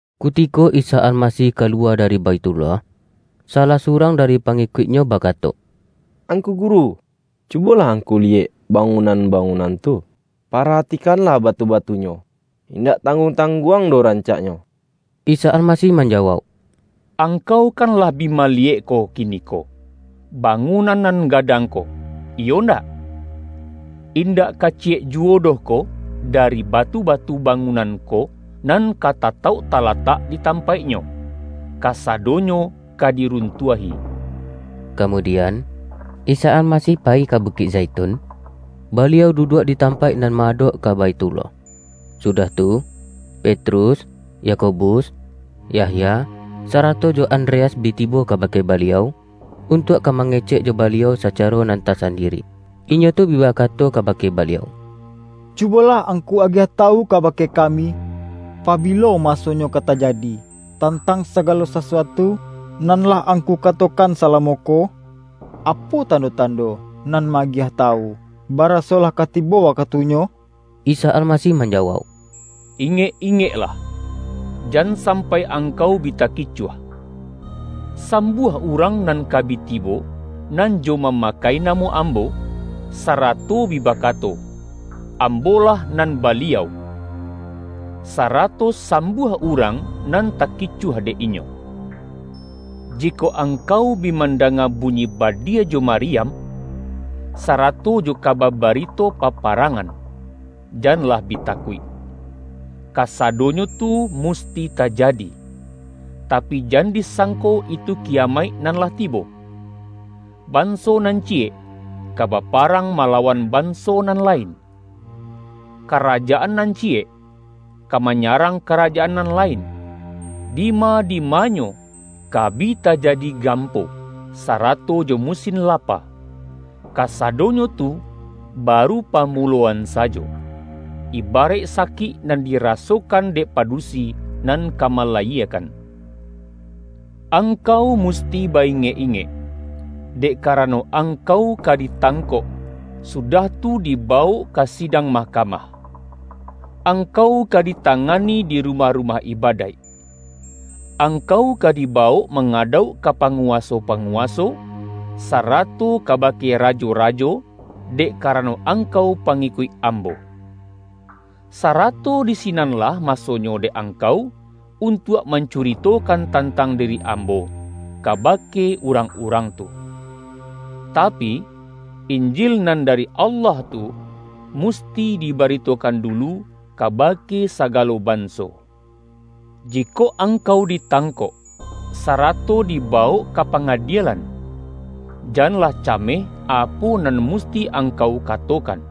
Kutiko Isa Almasih kaluwa dari Baithullah, salah surang dari pangikuik-Nyo bakato,”Angku Guru, cubolah Angku liyek bangunan-ba-ngunan tu. Paratikanlah batu-batu-nyo. Indak tangguang-tangguang doh rancaknyo” Isa Almasih manjawauk,”Angkau kan lah bi maliyek ko kiniko, bangunan nan gadang ko, iyo ndak? Indak ka ci-yek juwo doh ko dari batu-batu bangun-an ko, nan ka tatauk talatak di tampaik-nyo. Kasadonyo ka diruntuah-i.” Kamudian, Isa Almasih payi ka Bu-kik Zaitun, Baliau duduak di tampaik nan ma-adok ka Baithullah. Sudah tu, Petrus, Yakobus, Yahya, sarato jo An-dreas bi tibo kabake Baliau, untuak ka mangecek jo Baliau sacaro nan tasan-diri. Inyo tu bi bakato kabake Baliau,”Cubolah Angku agiah tawu kabake kami. Pabilo masonyo ka tajadi, tan-tang sagalo sasuatu nan lah Angku katokan salamo ko? Apo tando-tan-do nan ma-agiah tawu, baraso lah ka tibo wakatunyo?” Isa Almasih manjawauk,”Ingek-ingeklah, jan sampai angkau bi taki-cuah. Sambuah urang nan ka bi tibo, nan jo mamakai namo Ambo, sarato bi bakato, ’Ambo lah nan Baliau!’ sa-rato sambuah urang nan takicuah dek inyo. Jikok angkau bi mandanga bu-nyi badia jo mariam, sarato jo kaba barito paparangan, janlah bi takuik. Kasadonyo tu musti tajadi, tapi, jan disangko itu kiyamaik nan lah tibo. Banso nan ciyek, ka baparang mala-wan banso nan lain. Karajaan nan ci-yek, ka manyarang karajaan nan lain. Dima-dimanyo, ka bi tajadi gampo, sa-rato jo musin lapa. Kasadonyo tu ba-ru pamuloan sajo, ibaraik sakik nan dirasokan dek padusi nan ka mala-yiekan. Angkau musti ba-ingek-ingek, dek karano, angkau ka ditangkok, sudah tu dibawok ka sidang mahkamah. Angkau ka ditangani di rumah-rumah ibadaik. Angkau ka dibawok mangadauk ka pa-nguwaso-panguwaso, sarato kabake ra-jo-rajo, dek karano angkau pangikuik Ambo. Sarato di sinanlah masonyo dek angkau, untuak mancuritokan tantang diri Ambo, kabake urang-urang tu. Tapi, Injil nan dari Allah tu, musti dibaritokan dulu kabake sagalo banso. Jikok angkau ditangkok, sarato dibawok ka pangadielan, janlah ca-meh apo nan musti angkau katokan.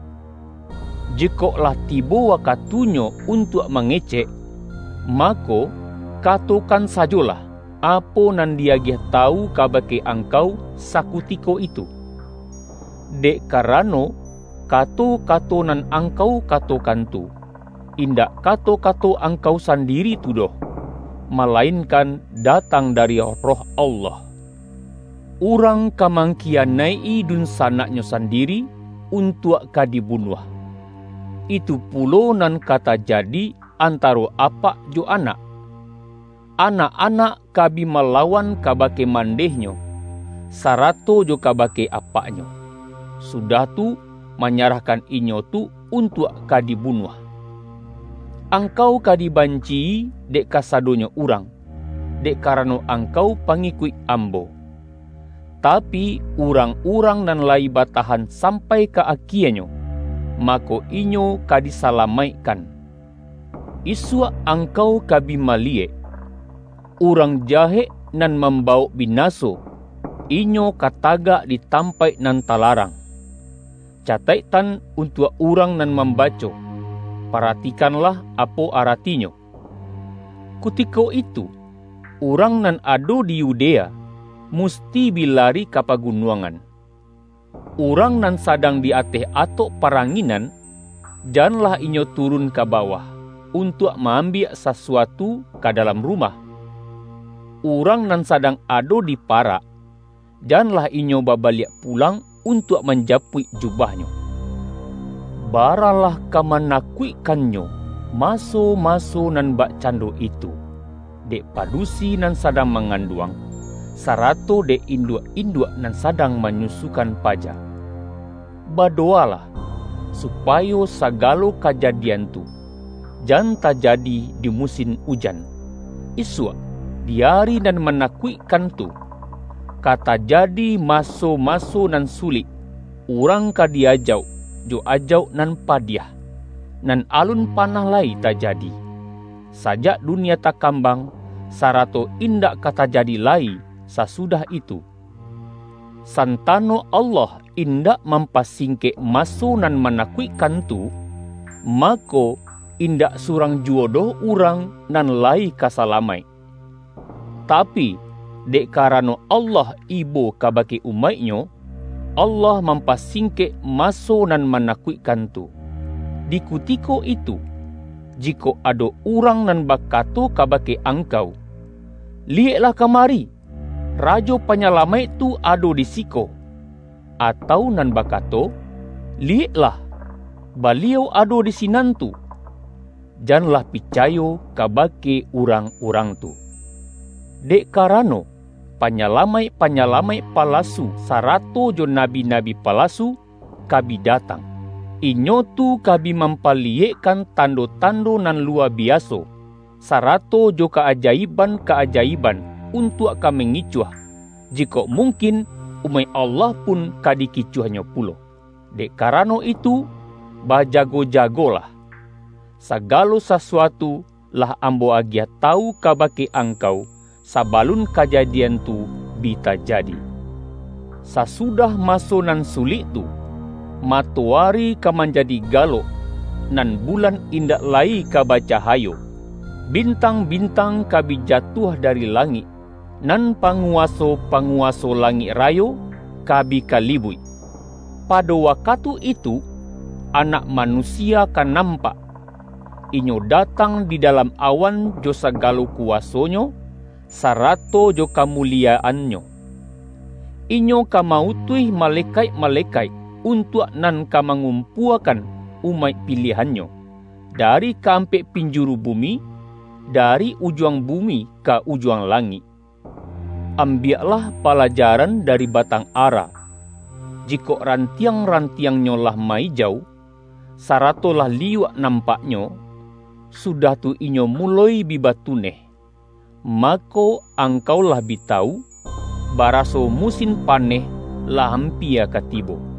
Jikok lah tibo wakatunyo untuak ma-ngecek, mako, katokan sajolah apo nan di-agiah tawu kabake angkau sakutiko itu. Dek karano, kato-kato nan ang-kau katokan tu, indak kato-kato ang-kau sandiri tu doh, malainkan datang dari Roh Allah. Urang ka mangki-yanaik-i dunsanaknyo sandiri, untuak ka dibunuah. Itu pulo nan ka tajadi antaro apak jo anak. Anak-anak ka bi malawan kabake mandehnyo, sarato jo kabake apaknyo, sudah tu manya-rahkan inyo tu untuak ka dibunuah. Angkau ka dibanci-i dek kasadonyo urang, dek karano angkau pangikuik Ambo. Tapi, urang-urang nan layi ba-tahan sampai ka akienyo, mako, inyo ka disalamaikkan.” ”Isuak angkau ka bi maliyek, ’Urang jahek nan mambawok binaso' inyo ka tagak di tampaik nan talarang. (Cataiktan untuak urang nan mambaco: Paratikanlah apo aratinyo!) Kutiko itu urang nan ado di Yudea musti bi lari ka pagunuangan. Urang nan sadang di ateh atok paranginan, janlah inyo tu-run ka bawah, untuak ma-ambiak sasu-atu ka dalam rumah. Urang nan sa-dang ado di parak, janlah inyo babaliak pulang untuak manjapuik jubahnyo. Baralah ka manakuikkannyo ma-so-maso nan bakcando itu, dek padusi nan sadang manganduang, sarato dek induak-induak nan sadang manyusu-kan paja! Badowalah, supayo saga-lo kajadian tu, jan tajadi di musin ujan. Isuak, di ari nan manakuikkan tu, ka tajadi maso-maso nan sulik, urang ka di-ajauk, jo ajauk nan padiah, nan alun panah lai tajadi, sajak dunia takam-bang, sarato indak ka tajadi lai sasudah itu. Santano Allah indak mampasing-kek maso nan manakuikkan tu, mako, indak surang juwo doh urang nan lai ka salamaik. Tapi, dek karano Allah ibo kabake umaik-Nyo, Allah mampasing-kek maso nan manakuikkan tu. Di kutiko itu, jikok ado urang nan bakato kabake angkau, ’Liyeklah ka-mari, Rajo Panyalamaik tu ado di si-ko!’ atau nan bakato, ’Liyeklah, Baliau ado di sinan tu!’ janlah picayo ka-bake urang-urang tu. Dek karano, panyalamaik-panyalamaik palasu, sa-rato jo nabi-nabi palasu, ka bi datang. Inyo tu ka bi mampaliyekkan tando-tando nan luwa biaso, sarato jo ka-aja-iban-ka-ajaiban, untuak ka mangicuah, jikok mungkin, umaik Allah pun ka dikicuahnyo pulo. Dek karano itu, bajago-jagolah! Sagalo sasuatu lah Am-bo agiah tawu kabake angkau, saba-lun kajadian tu bi tajadi.” ”Sasudah maso nan sulik tu, mato-ari ka manjadi galok, nan bulan indak lai ka bacahayo. Bintang-bintang ka bi jatuah dari langik, nan panguwaso-panguwaso langik rayo ka bi kalibuik. Pado wakatu itu, Anak Manusia ka nampak, Inyo datang di dalam awan jo sagalo kuwaso-Nyo, sarato jo kamu-liyaan-Nyo. Inyo ka ma-utuih ma-lekaik-malekaik, untuak nan ka ma-ngumpuakan umaik piliahan-Nyo, dari ka-ampek pinjuru bumi, dari ujuang bumi ka ujuang langik.” ”Ambiaklah palajaran dari batang ara. Jikok rantiang-rantiangnyo lah ma-ijau, sarato lah liyuak nampaknyo, sudah tu inyo muloi bi batuneh, mako, angkau lah bi tawu, baraso mu-sin paneh lah ampia ka tibo.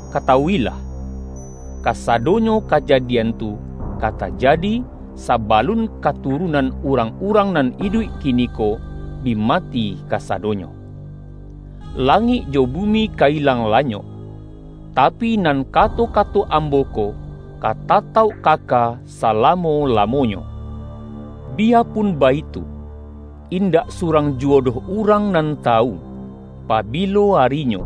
Katawu-ilah! Kasadonyo ka-jadian tu ka tajadi, sabalun katurunan urang-urang nan iduik kiniko, bi mati kasadonyo. Langik jo bumi ka ilang lanyok, tapi, nan kato-kato Ambo ko ka tatauk kaka salamo-lamonyo.” ”Biyapun baitu, indak surang ju-wo doh urang nan tawu, pabilo arinyo,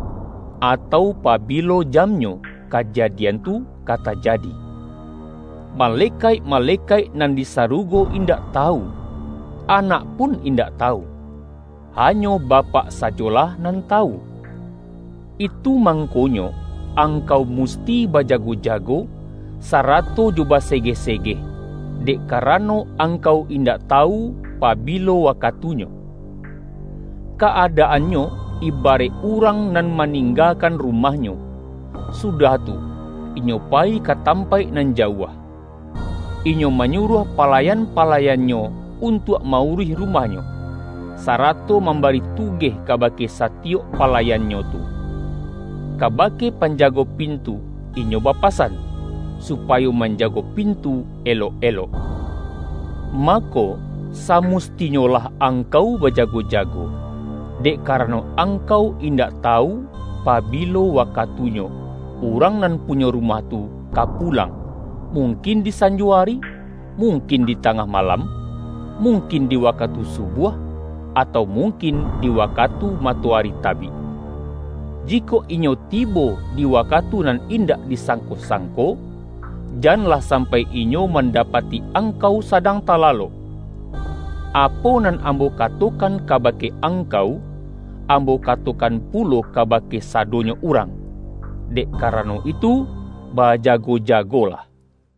atau pabilo jamnyo kajadian tu ka ta-jadi. Malekaik-malekaik nan di saru-go indak tawu, Anak pun indak tawu, hanyo Bapak sajolah nan tawu. Itu mangkonyo, angkau musti bajago-jago, sarato jo basegeh-segeh, dek karano angkau indak tawu pabilo wakatunyo. Ka-adaannyo, ibaraik urang nan ma-ninggakan rumahnyo, sudah tu, inyo payi ka tampaik nan jauah. Inyo ma-nyuruah palayan-palayannyo untuak ma-uruih rumahnyo, sarato mambari tugeh kabake satiyok palayannyo tu. Kabake panjago pintu inyo bapasan, su-payo manjago pintu elok-elok. Mako samustinyolah angkau bajago-jago, dek karano angkau indak tawu, pabilo wa-katunyo urang nan punyo rumah tu ka pulang mungkin di sanjo ari, mung-kin di tangah malam, mungkin di wa-katu subuah, atau mungkin di waka-tu matoari tabik. Jikok inyo tibo di wakatu nan indak disangko-sangko, janlah sampai inyo mandapati ang-kau sadang talalok. Apo nan Ambo katokan kabake angkau, Ambo kato-kan pulo kabake sadonyo urang: dek karano itu, bajago-jagolah!”